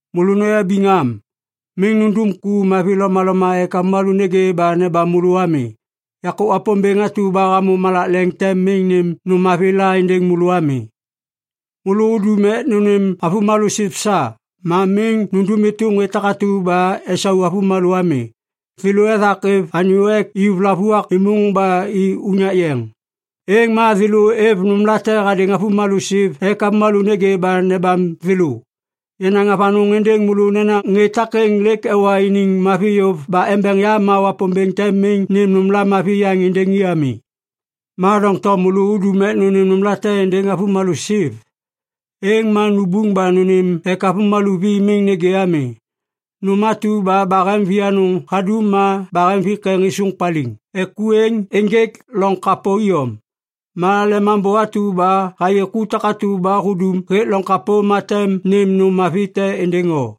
“Môlô noyabiŋ am! Miŋ nundum ku mavi lomaloma ek avômalô nêgê ba nebam môlô ami. Yakô Wapômbêŋ atu ba hamô malak leŋ tem miŋ nêm nôm mavi la êndêŋ môlô ami. “Môlô udum ek nônêm avômalô siv sa, ma miŋ nundum êtôm ŋê takatu ba esau avômalô ami. Thêlô ethak êv anyô ek iyuv lavuak êmôŋ ba i unyak yeŋ. Êŋ ma thêlô êv nômlate hadêŋ avômalô siv ek avômalô nêgê ba nebam thêlô. Yanaŋ avanôŋ êndêŋ môlô nena ŋê takêŋ lêk ewa iniŋ mavi yôv ba embeŋ yam ma Wapômbêŋ tem miŋ nêm nôm mavi yaŋ êndêŋ i ami. Ma doŋtom môlô udum ek nônêm nômlate êndêŋ avômalô siv, êŋ ma nubuŋ ba nônêm ek avômalô vi miŋ nêgê ami. Nôm atu ba bahem vianôŋ hadum ma bahem vikeŋ êsôŋ paliŋ ek ku êŋ ênjêk loŋ kapô iyom. Ma Lemambô atu ba hayê ku takatu ba hudum hêk loŋ kapô ma tem nêm nôm mavi te êndêŋ o.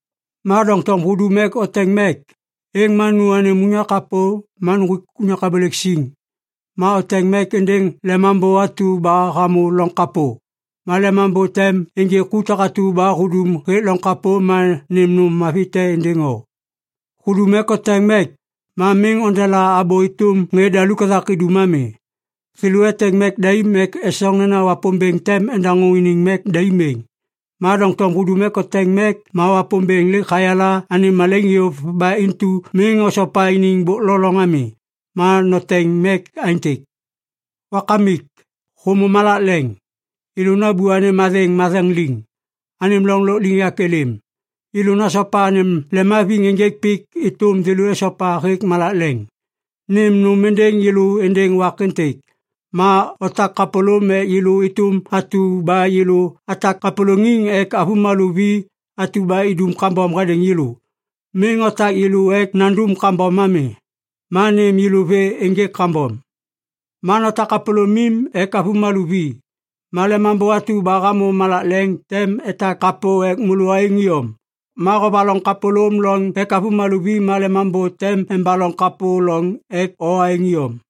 Ma doŋtom hudum ek oteŋ mek, êŋ ma nu anêm unyak kapô ma nuŋgwik unyak abôlêk siŋ. Ma oteŋ mek êndêŋ Lemambô atu ba hamô loŋ kapô. Ma Lemambô tem ênjê ku takatu ba hudum hêk loŋ kapô ma nêm nôm mavi te êndêŋ o. “Hudum ek oteŋ mek, ma miŋ ondela abô êtôm ŋê daluk ethak idum ami. Thêlô eteŋ mek daim ek esoŋ nena Wapômbêŋ tem endaŋô iniŋ mek daim êŋ. Ma doŋtom hudum ek oteŋ mek ma Wapômbêŋ lêk hayala anêm malaiŋ yôv ba intu miŋ osopa iniŋ bôk lo loŋ ami. Ma noteŋ mek aêntêk, “‘Wakamik, hômô malak leŋ. Yêlô nambô anêm athêŋ matheŋ liŋ. Anêm loŋ lôkliŋyak êlêm. Yêlô nasopa anêm lemhaviŋ ênjêk pik êtôm thêlô esopa hêk malak leŋ. Nêm nôm êndêŋ yêlô êndêŋ wak êntêk. Ma otak kapôlôm ek yêlô êtôm atu ba yêlô atak kapôlôŋiŋ ek avômalô vi atu ba idum kambom hadêŋ yêlô. Miŋ otak yêlô ek nandum kambom ami. Ma nêm yêlô vê ênjêk kambom.’ “Ma notak kapôlômim ek avômalô vi, ma Lemambô atu ba hamô malak leŋ tem etak kapô ek môlô aêŋ iyom. Ma hovaloŋ kapôlôm lôŋ ek avômalô vi, ma Lemambô tem embaloŋ kapô loŋ ek o aêŋ iyom.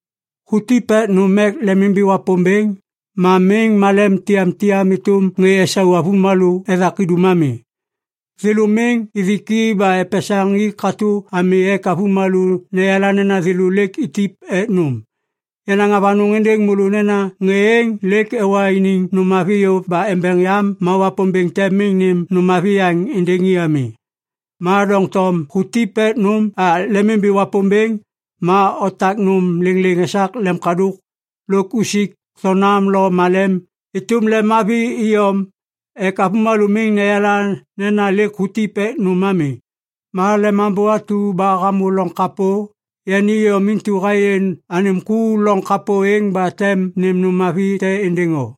“Hutip ek nôm ek lemimbi Wapômbêŋ, ma miŋ malem tiyamtiyam êtôm ŋê esau avômalô ethak idum ami. Thêlô miŋ ithik i ba epesaŋ i katô ami ek avômalô neyala nena thêlô lêk itip ek nôm. Yanaŋ avanôŋ êndêŋ môlô nena ŋê êŋ lêk ewa iniŋ nôm mavi yôv ba embeŋ yam ma Wapômbêŋ tem miŋ nêm nôm mavi yaŋ êndêŋ i ami. Ma doŋtom hutip ek nôm ek lemimbi Wapômbêŋ, ma otak nôm lêŋlêŋ esak lemkadôk lôk usik thonam lo malem êtôm lemmavi iyom ek avômalô miŋ neyala nena lêk hutip ek nôm ami. Ma lemambô atu ba hamô loŋ kapô, yani iyom intu hayê anêm ku loŋ kapô êŋ ba tem nêm nôm mavi te êndêŋ o.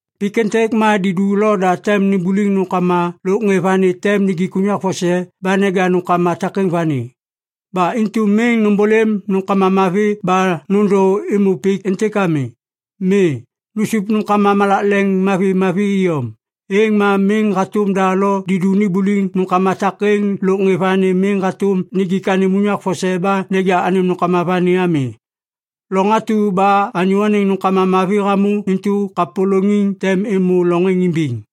“Pik êntêk ma didu lo da tem nimbuliŋ nômkama lôk ŋê vani tem nijik unyak vose ba neja nômkama takêŋ vani. Ba intu miŋ nômbôlêm nômkama mavi ba nôndô êmô pik êntêk ami. Mi, nusup nômkama malak leŋ mavimavi iyom. Êŋ ma miŋ hatôm da lo didu nimbuliŋ nômkama takêŋ lôk ŋê vani miŋ hatôm nijik anêm unyak vose ba neja anêm nômkama vani ami. Loŋ atu ba anyô anêŋ nômkama mavi hamô intu kapôlôŋiŋ tem êmô loŋ êŋ imbiŋ.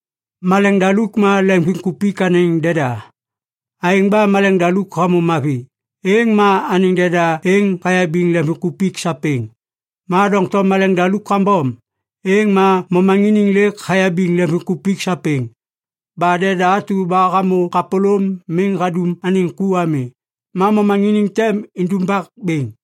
“Maleŋdaluk ma leŋviŋkupik anêŋ deda. Aêŋ ba malemdaluk hamô mavi, êŋ ma anêŋ deda êŋ hayabiŋ lemvimkupik sapêŋ. Ma doŋtom maleŋdaluk kambom, êŋ ma momaŋiniŋ lêk hayabiŋ leŋviŋkupik sapêŋ. Ba deda atu ba hamô kapôlôm miŋ hadum anêŋ ku ami, ma momaŋiniŋ tem indumbak bêŋ.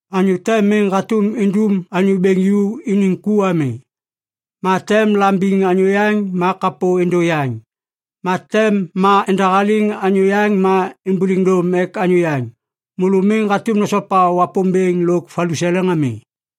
“Anyô te miŋ hatôm indum anyô bêŋ ju iniŋ ku ami. Ma tem la imbiŋ anyô yaŋ ma kapô êndô yaŋ. Ma tem ma endahaliŋ anyô yaŋ ma imbuliŋ dôm ek anyô yaŋ. Môlô miŋ hatôm nosopa Wapômbêŋ lôk valuseleŋ ami.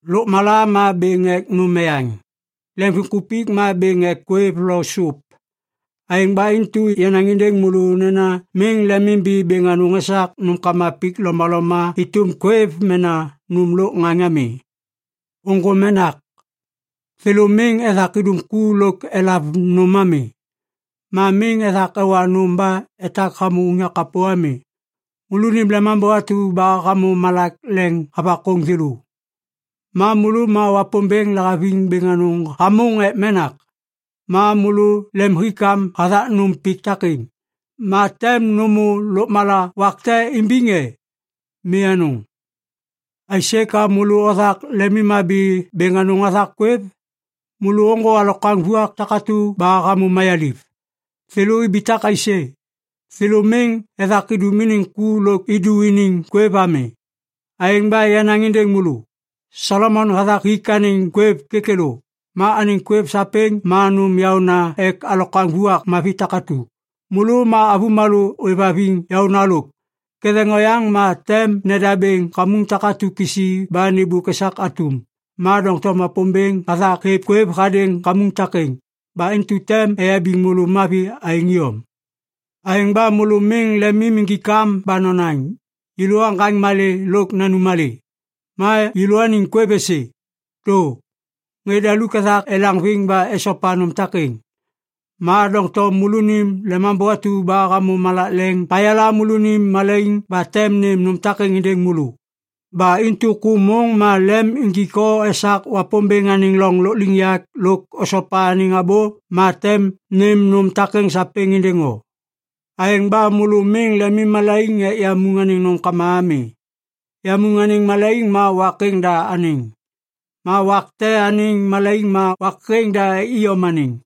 “Lôkmala ma bêŋ ek nôm eyaŋ. Leŋviŋkupik ma bêŋ ek kwêv lo sup. Aêŋ ba intu yanaŋ êndêŋ môlô nena miŋ lemim imbi bêŋ anôŋ esak nômkama pik lomaloma êtôm kwêv mena nôm lôk ŋaŋ ami. Ôŋgô menak. Thêlô miŋ ethak idum ku lôk elav nôm ami. Ma miŋ ethak ewa nôm ba etak hamô unyak kapô ami. Môlônim Lemambô atu ba hamô malak leŋ havakôŋ thêlô. Ma môlô ma Wapômbêŋ lahaviŋ bêŋ anôŋ hamôŋ ek menak. Ma môlô lemhikam hathak nôm pik takêŋ, ma tem nômô lôkmala wak te imbiŋ e? Mi anôŋ! “Aisê ka môlô othak lemimhabi bêŋ anôŋ hathak kwêv? Môlô ôŋgô alokwaŋ vuak takatu ba hamô mayaliv. Thêlô ibitak aisê? Thêlô miŋ ethak idum iniŋ ku lôk idu iniŋ kwêv ami. Aêŋ ba yanaŋ êndêŋ môlô! Solomon hathak hik anêŋ kwêv kêkêlô. Ma anêŋ kwêv sapêŋ ma nôm yaôna ek alokwaŋ vuak mavi takatu. Môlô ma avômalô ôêvhaviŋ yaôna lôk! Ketheŋ oyaŋ ma tem nedabêŋ kamuŋ takatu kisi ba nêmbôk esak atum! Ma doŋtom Wapômbêŋ hathak hêv kwêv hadêŋ kamuŋ takêŋ. Ba intu tem eyabiŋ môlô mavi aêŋ iyom. Aêŋ ba môlô miŋ lemim injik am ba nonaŋ, ‘Yêlô aŋgaŋ malê lôk nanum malê?’ ma ‘Yêlôaniŋ kwêv êsê?’ Dô. Ŋê daluk ethak elaŋviŋ ba esopa nôm takêŋ. Ma doŋtom môlônim Lemambô atu ba hamô malak leŋ hayala môlônim malaiŋ ba tem nêm nôm takêŋ êndêŋ môlô. Ba intu ku môŋ ma lem injik o esak Wapômbêŋ anêŋ loŋ lôkliŋyak lôk osopa anêŋ abô ma tem nêm nôm takêŋ sapêŋ êndêŋ o. Aêŋ ba môlô miŋ lemimmalaiŋ ek yamuŋ anêŋ nômkama ami. Yamuŋ anêŋ malaiŋ ma wak êŋ da anêŋ. Ma wak te anêŋ malaiŋ ma wak êŋ da iyom anêŋ.